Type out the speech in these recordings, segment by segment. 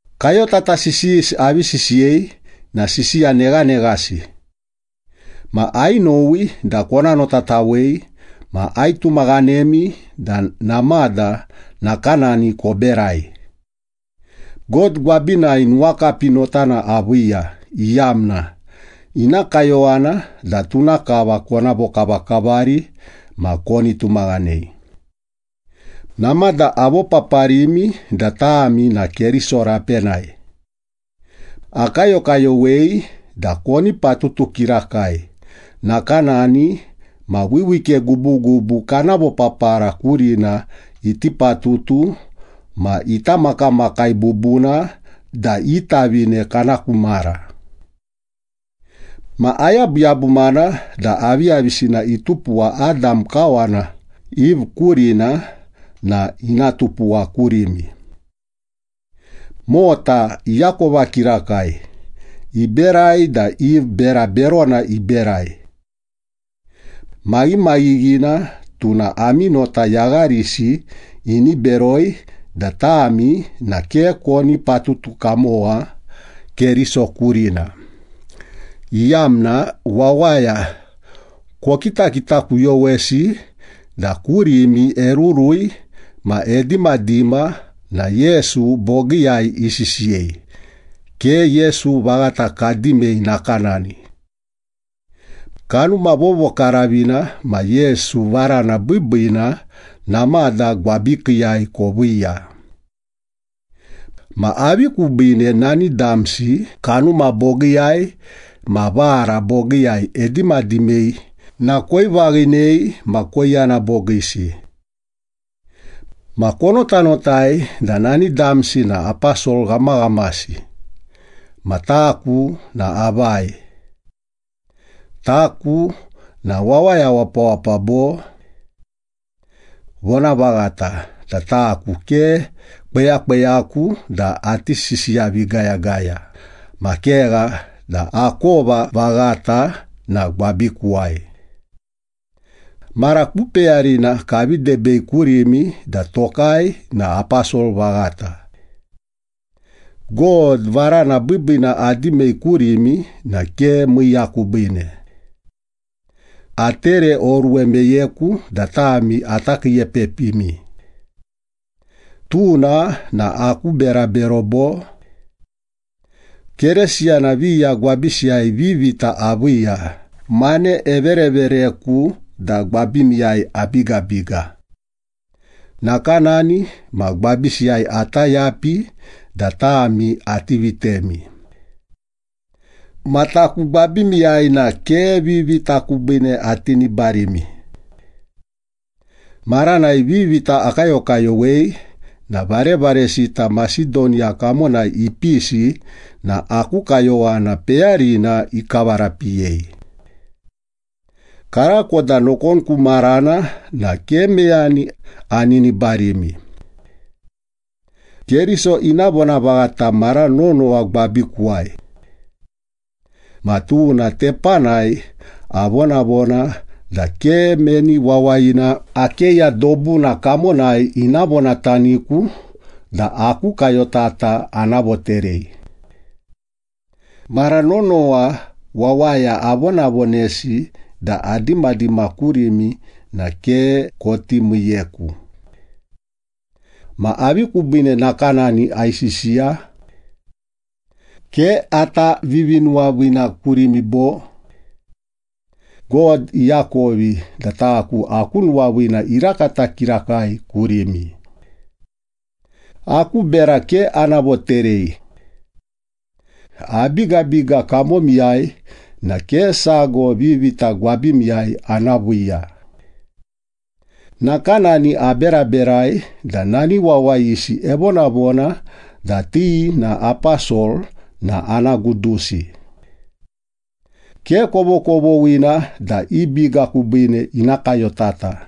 Kayotata sisiyisi avi sisiyei na sisiya neghaneghasi. Ma ainowi da kona notatawei ma aitumaghanemi da namada nakanani koberai. God gwabinai nuwakapi notana aviiya, iyamna ina kayowana da tuna kava kona vokavakavari ma koni tumaghanei. Namada avopaparimi da tami na Keriso rapenai. Akayokayowei da koni patutu kirakai, nakanani ma wiwike gubugubu kana vopapara kurina iti patutu ma ita makamakai bubuna da i tavine kana ku mara. Ma ayabuyabumana da aviyavisina itupuwa Adam kawana Eve kurina na ina tupuwa kurimi. Mota iakova kirakai, iberai da Eve bera berona iberai. Maghimaghighina tuna ami nota yagharisi ini beroi da tami na ke koni patutu kamowa Keriso kurina, iyamna wawaya kokitakitakuyowesi da kurimi erurui ma edimadima na Yesu bogiiyai isisiyei, ke Yesu vaghata kadimei nakanani. Kanuma Vovokaravina ma Yesu varana biibiina namada gwabikiiyai koviiya. Ma avi kubiine nani damsi kanuma bogiiyai ma vara bogiiyai edimadimei na koivaghinei ma koiyana bogiisi? Ma konotanotai da nani damsi na aposol ghamaghamasi, ma taku na avai? Taku na wawaya wapawapa, bo? Vonavaghata da taku ke kweyakweyaku da ati sisiyavigayagaya, ma kegha da akova vaghata na gwabikuwai. Mara ku peyarina kavi debei kurimi da tokai na aposol vaghata. God varana biibiina adimei kurimi na ke miiya kubiine. Atereoruwe meyeku da tami ata kiiepepimi. Tuna na aku berabero, bo? Keresiyana viya gwabisiyai vivita aviiya, mane everevereku da gwabimiyai abigabiga. Nakanani ma gwabisiyai ata yapi da tami ati vitemi. Ma taku gwabimiyai na ke vivita kubiine atinibarimi. Maranai vivita akayokayowei na varevaresita Masedoniya kamonai ipisi na aku kayowana peyarina ikavarapiyei. Karako da nokon ku marana na ke meyani aninibarimi. Keriso ina vonavaghata mara nonowa gwabikuwai. Ma tuna tepanai avonavona da ke meni wawayina Akeya dobuna kamonai ina vonataniku da aku kayotata ana voterei. Mara nonowa wawaya avonavonesi da adimadima kurimi na ke koti miiyeku. Ma avi kubiine nakanani aisisiya? Ke ata vivinuwaviina kurimi bo? God iakovi da taku aku nuwaviina irakata kirakai kurimi! Aku bera ke ana voterei. Abigabiga kamomiyai na ke sago vivita gwabimiyai ana viiya. Nakanani aberaberai da nani wawayisi evonavona da ti na aposol na ana gudusi. Ke kovokovoghina da i biga kubiine ina kayotata.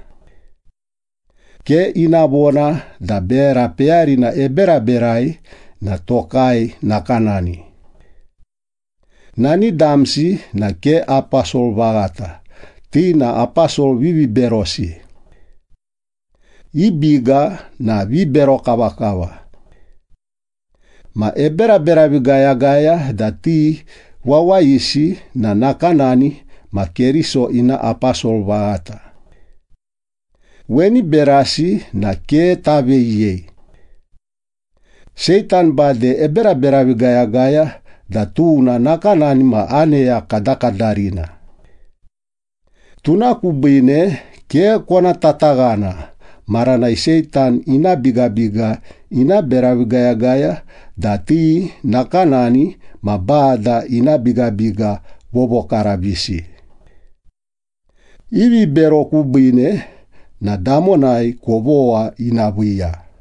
Ke ina vona da bera peyarina eberaberai na tokai nakanani. Nani damsi na ke aposol vaghata, ti na aposol viviberosi. I biga na vibero kavakava. Ma eberaberavigayagaya da ti wawayisi na nakanani ma Keriso ina aposol vaghata. Weni berasi na ke taveyiyei. Seitan bade eberaberavigayagaya da tuna nakanani ma aneya kadakadarina. Tuna kubiine ke kona tataghana maranai Seitan ina bigabiga ina beravigayagaya da ti nakanani ma Bada ina bigabiga vovokaravisi. I vibero kubiine na damonai kovogha ina viiya.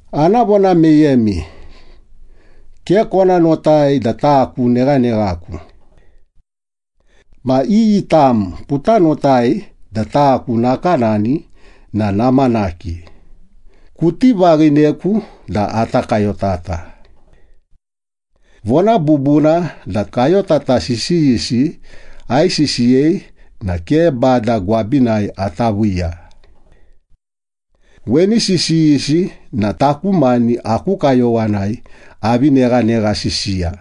Ana vona meyemi. Ke kona notai da taku neghaneghaku. Ma iyi tam kuta notai da taku nakanani na namanaki, kuti vaghineku da ata kayotata. Vona bubuna da kayotata sisiyisi aisisiyei na ke Bada gwabinai ata viiya. Weni sisiyisi na taku mani aku kayowanai avi neganeghasisiya.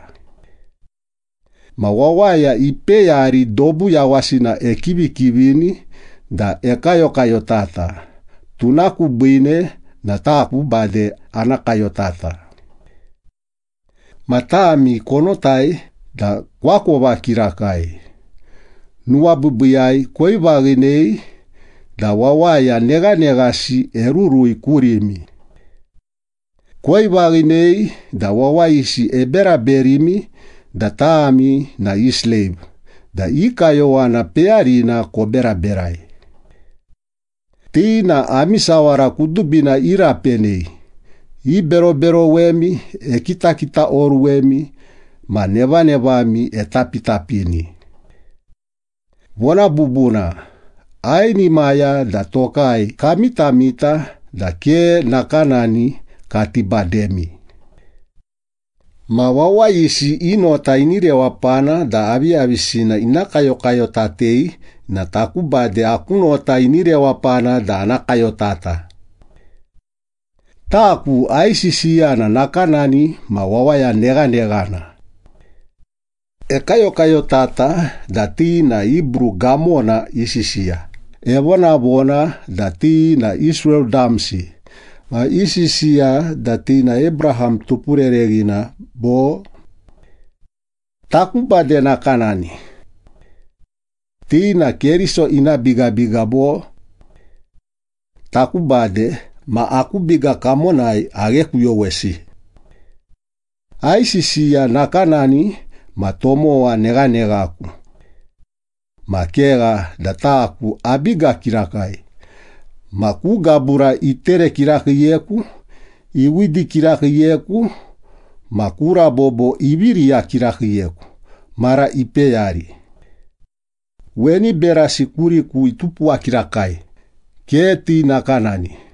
Ma wawaya ipeyari dobu yawasina ekivikivini da ekayokayotata, tuna kubiine na taku bade ana kayotata. Ma tami konotai da koakova kirakai, nuwabiibiiyai koivaghinei da wawaya neghaneghasi erurui kurimi. Koivaghinei da wawayisi eberaberimi da tami na i sleiv da i kayowana peyarina koberaberai. Ti na ami sawara kudubina irapenei, iberoberowemi, ekitakitaoruwemi ma nevanevami etapitapini. Vona bubuna, ainimaya da tokai kamitamita da ke nakanani kati bademi. Ma wawayisi i nota ini rewapana da aviyavisina ina kayokayotatei na taku bade aku nota ini rewapana da ana kayotata. Taku aisisiya na nakanani ma wawaya neghaneghana. Ekayokayotata da ti na Hibru gamona isisiya, evonavona da ti na Israel damsi, ma isisiya da ti na Abraham tupurereghina, bo? Taku bade nakanani. Ti na Keriso ina bigabiga, bo? Taku bade, ma aku biga kamonai aghekuyowesi. Aisisiya nakanani ma tomowa neghaneghaku. Ma kegha da taku abiga kirakai, ma ku gabura itere kirakiiyeku, iwidi kirakiiyeku ma ku rabobo ivi riya kirakiiyeku mara ipeyari. Weni berasi kuriku itupuwa kirakai, ke ti nakanani.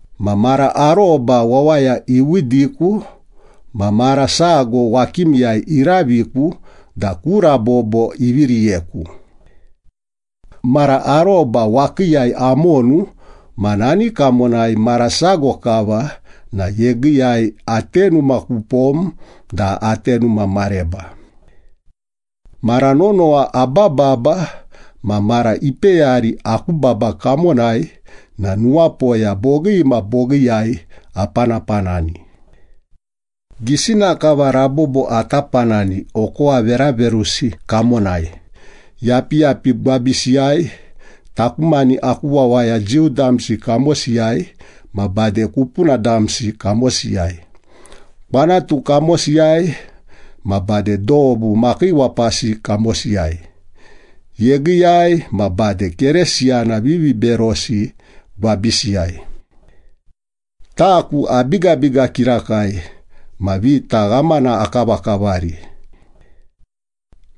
Ma mara aroba wawaya iwidiku ma mara sago wakimiyai iraviku da ku rabobo ivi riyeku. Mara aroba wakiiyai amonu ma nani kamonai mara sago kava na yegiiyai atenuma kupom da atenuma mareba. Mara nonowa abababa ma mara ipeyari aku baba kamonai na nuwapoya bogii ma bogiiyai apanapanani. Gisina kava rabobo ata panani okowa veraverusi kamonai, yapiyapi gwabisiyai, taku mani aku wawaya Jiu damsi kamosiyai ma bade kupuna damsi kamosiyai, kwanatu kamosiyai ma bade dobu makiiwapasi kamosiyai, yegiiyai ma bade Keresiyana viviberosi gwabisiyai. Taku abigabiga kirakai ma vita ghamana akavakavari.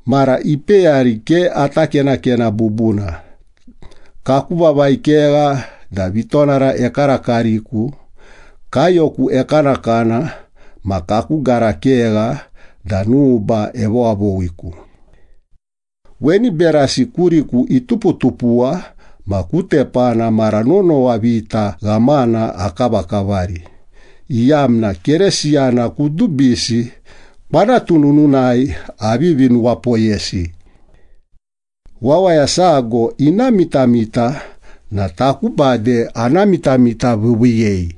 Mara ipeyari ke ata kenakena bubuna, kaku vavai kegha da vitonara ekarakariku, kaiyoku ekanakana ma kaku gara kegha da nuba evowavowiku. Weni berasi kuriku ituputupuwa ma ku tepana mara nonowa vita ghamana akavakavari, iyamna Keresiyana kudubisi kwanatu nununai avivi nuwapoyesi. Wawaya sago ina mitamita na taku bade ana mitamitaviiviiyei.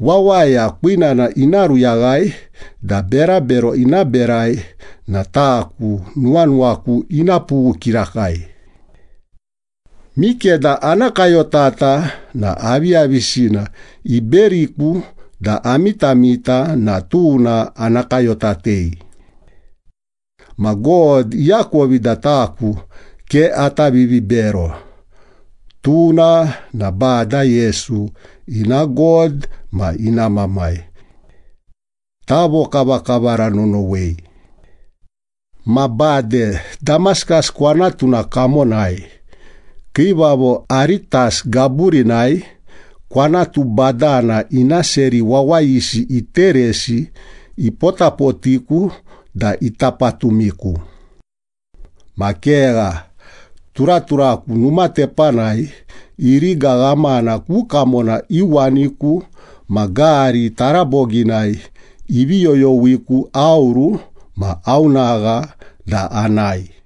Wawaya kwinana ina ruyaghai da berabero ina berai na taku nuwanuwaku ina pughu kirakai. Mikeda ana kayotata na aviyavisina iberiku da amitamita na tuna ana kayotatei. Ma God iakovi da taku ke ata vivibero. Tuna na Bada Yesu ina God ma ina Mamai. Tavokavakavara nonowei. Ma bade Damaskas kwanatuna kamonai, Kiivavo Aretas gaburinai, kwanatu badana ina seri wawayisi iteresi ipotapotiku da ita patumiku. Ma kegha, turaturaku numa tepanai iriga ghamana ku kamona iuwaniku ma gari taraboginai ivi yoyowiku aoru ma aonagha da anae.